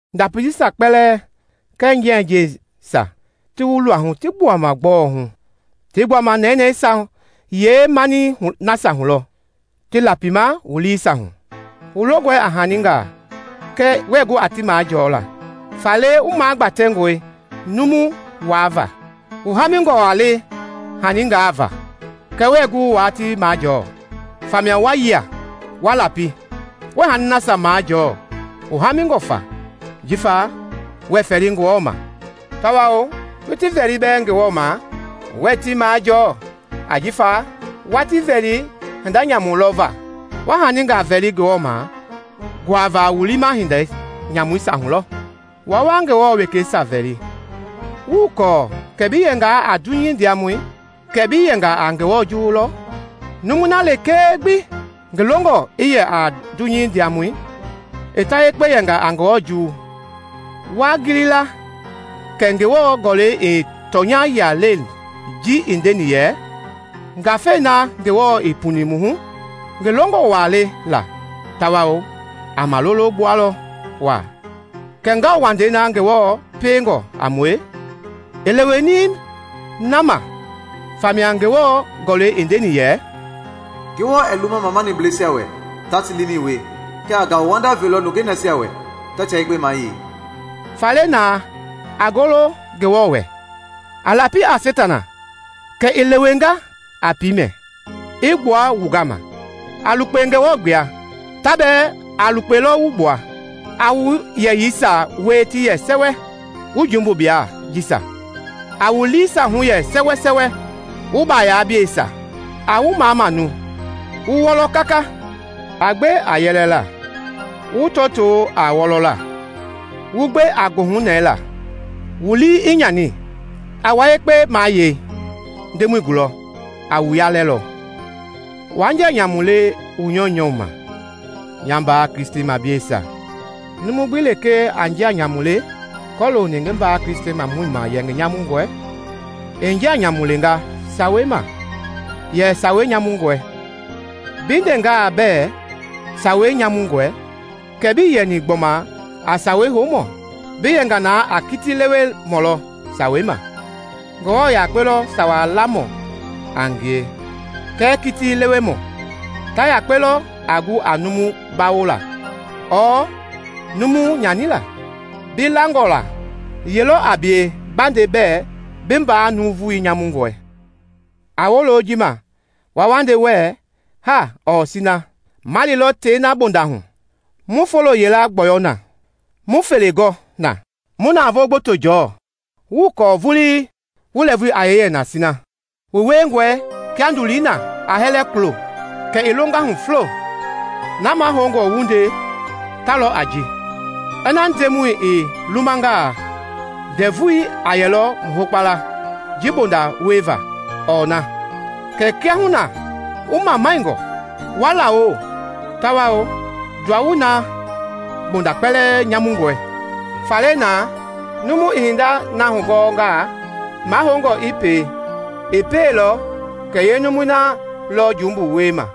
Ndapi jisia kpɛlɛɛ kɛɛ njianjiɛisia ti wu luahu ti gbuama gbɔɔ hu? Tii gbuama nɛnɛɛisia yeemanii nasia hu lɔ ti lapima wu liisia hu? Wu longɔe a haningaa kɛɛ wuɛɛ gu a ti majɔɔla, faale wu magbatɛngɔe numu waava. Wu haamingɔ waa le haningaa va kɛɛ wuɛɛ gu waa ti majɔɔ, famia wa yia, wa lapi. Wuɛɛ hanii nasia majɔɔ wu haamingɔ fa jifa wuɛɛ fɛli Ngewɔ ma. Tawao wu ti vɛli bɛɛ Ngewɔ ma wuɛɛ ti majɔɔ ajifa wa ti vɛli hinda nyamu lɔ va. Wa haningaa vɛli Ngewɔ ma nguava wu liima hinda nyamuisia hu lɔ. Wua wa Ngewɔ wekeisia vɛli! Wuii kɔɔ kɛ bi yɛngaa a dunyei ndiamɔ kɛ bi yɛnga a Ngewɔ juwu lɔ? Numui na lekee gbi ngi longɔ i yɛ a dunyei ndiamɔ, i ta yekpe yɛnga a Ngewɔ juwu. Waa gili la kɛ Ngewɔ Gɔlɛi ii tɔnya yia leni ji i ndeni yɛ, “Ngafei na Ngewɔ i puni mu hu, ngi longɔ waa le la tawao a malolo gbualɔ waa.” Kɛɛ ngauwandei na Ngewɔ piengɔ a mue i leweni na ma. Famia Ngewɔ Gɔlɛi i ndeni yɛ, “Ngewɔ ɛɛ luma mamaniblɛisia wɛ taa ti liimɛi wie, kɛɛ a ngauwanda velɔ nungei nasia wɛ ta tia yekpe mayei.” Faale na, a golo Ngewɔ wɛ. A lapi a Seitana kɛ i lewenga a piimɛ i gbua wu gama. A lukpe Ngewɔ gbla, ta bɛɛ a lukpelɔ wu gbla. A wu yeyɛisia wua ti yɛ sɛwɛ, wu jumbublɛi jisia! A wu liisia hu yɛ sɛwɛsɛwɛ, wu baayablɛi jisia! A wu mamamau, wu wɔlɔ kaka; a gbe a yɛlɛla wu tɔtoo a wɔlɔla, wu gbe a goohunɛɛla wu lii i nyani. A wua yekpe mayei Ndemɔi gulɔ, a wu yalɛlɔ. Waa njia nyamu le wu nyɔunyɔu ma, nya mbaa Kristimableisia. Numu gbi lekee a njia nyamu le kɔlooni ngi mbaa Kristimamɔ ma yɛ ngi nyamungɔe, i njia nyamu lenga Sawei ma yɛ Sawei nyamungɔe. Bi ndengaa bɛɛ Sawei nyamungɔe, kɛ bii yɛni gbɔma a Sawei houmɔ, bi yɛnga na a kiti lewemɔ lɔ Sawei ma. Ngewɔ yakpe lɔ Sawa lamɔ a ngie kɛɛ kiti lewemɔ. Ta yakpe lɔ a gu a numu bawola ɔɔ numu nyanila. Bi langɔ la yelɔ a bie ba nde bɛɛ bi mbaa nuuvu nyamungɔe? A wolo ji ma, wua wa nde wuɛɛ, “Haa ɔɔ sina ma lilɔ tei na bonda hu, mu foo yila gbɔyɔ na, mu fele gɔ na, mu navoo gboto jɔɔ.” Wuii kɔɔ vulii wu lɛɛvui a yee yɛ na sina! Wu wiengɔe kia ndulii na a hɛlɛ kulo kɛ i longa hu fulo. Na mahoungɔ wu nde ta lɔ a ji: “Ina Ndemɔi i lumangaa, ndɛvu a yɛlɔ mu hokpala ji bonda wieva ɔɔ na.” Kɛɛ kiahuna wu mamaingɔ, wa lawo; tawao ndawoei na bonda kpɛlɛɛ nyamungɔe. Faale na, numu i hindei na gɔngaa mahoungɔ i pie, ii pieilɔ, kɛ yeenumui na lɔ jumbu wiema.